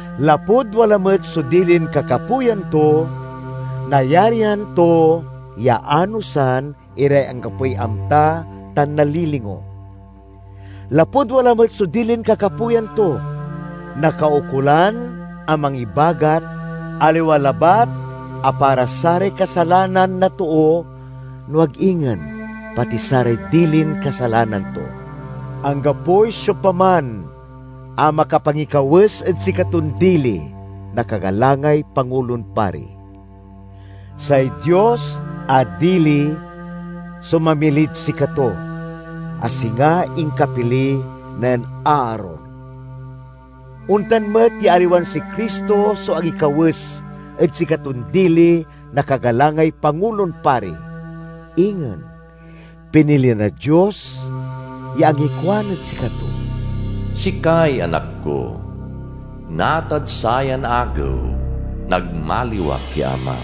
Lapud wala met so dilin kakapoyan to, nayarian to ya anosan iray anggapoy amta tan nalilingo. Lapud wala met so dilin kakapoyan to, nakaukolan a mangibagat aliwa labat a para saray kasalanan na too, no ag ingen pati saray dilin kasalanan to. Anggapoy siopaman a makapangikawes ed sikaton dili na kagalangay Pangulon Pari. Say Dios a dili so mamilid sikato, a singa inkapili nen Aaron. Ontan met ya aliwan si Cristo so angikawes ed sikaton dili na kagalangay pangulon pari. Ingen, pinili na Dios ya angikuan ed sikato, "Sikay Anak ko, natad sayan agew nagmaliw ak ya Amam."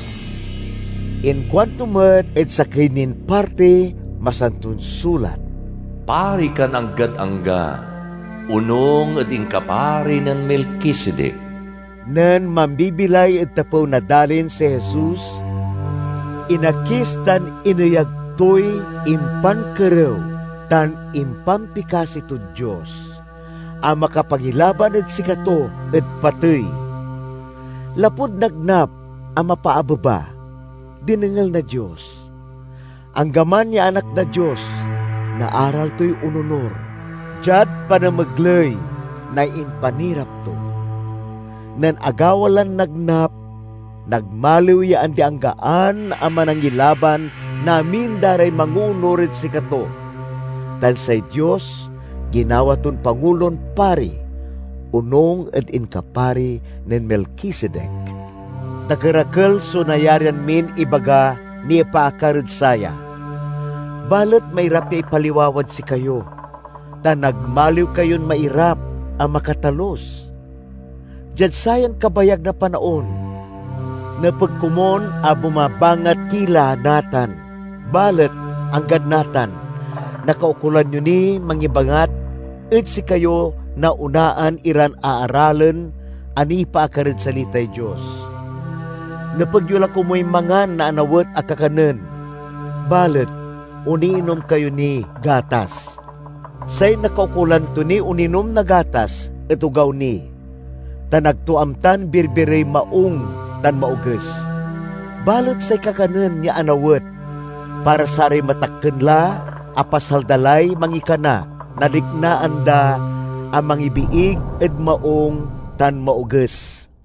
Inkuanto met ed sakey nin partiy Masanton Sulat, "Pari kan anggad angga, onung ed inkapari nen Melkisedek." Nen mambibilay ed tapew na dalin si Jesus, inakis tan ineyag toy impankerew tan impampikasi tod Dios a makapangilaban ed sikato ed patey. Lapud nagnap a mapaabeba, dinengel na Dios. Anggaman ya Anak na Dios, naaral toy ononur diad panamegley na impanirap to. Nen agawa lan nagnap, nagmaliw ya andi-anggaan a Manangilaban na amin da ray mangoonur ed sikato, tan say Dios ginawa ton Pangulon Pari, onung ed inkapari nen Melkisedek. Dakerakel so nayarian min ibaga nipaakar ed saya, balet mairap ya ipaliwawad sikayo, ta nagmaliw kayon mairap a makatalus. Diad sayan kabayag na panaon, nepeg komun a bumabangat ki la natan balet, anggad natan, nakaukolan yo niy mangibangat ed sikayo na onaan iran aaralen a nipaakar ed salitay Dios. Nepeg yo la komuy mangan na anawet a kakanen, balet oniinom kayo niy gatas. Say nakaukolan to niy oninom na gatas et ogaw ni, tan ag to amtan birbirey maung tan maoges. Balet say kakanen ya anawet, para saray matakken la a pasal da lay mangikana na liknaan da a mangibiig ed maung tan maoges.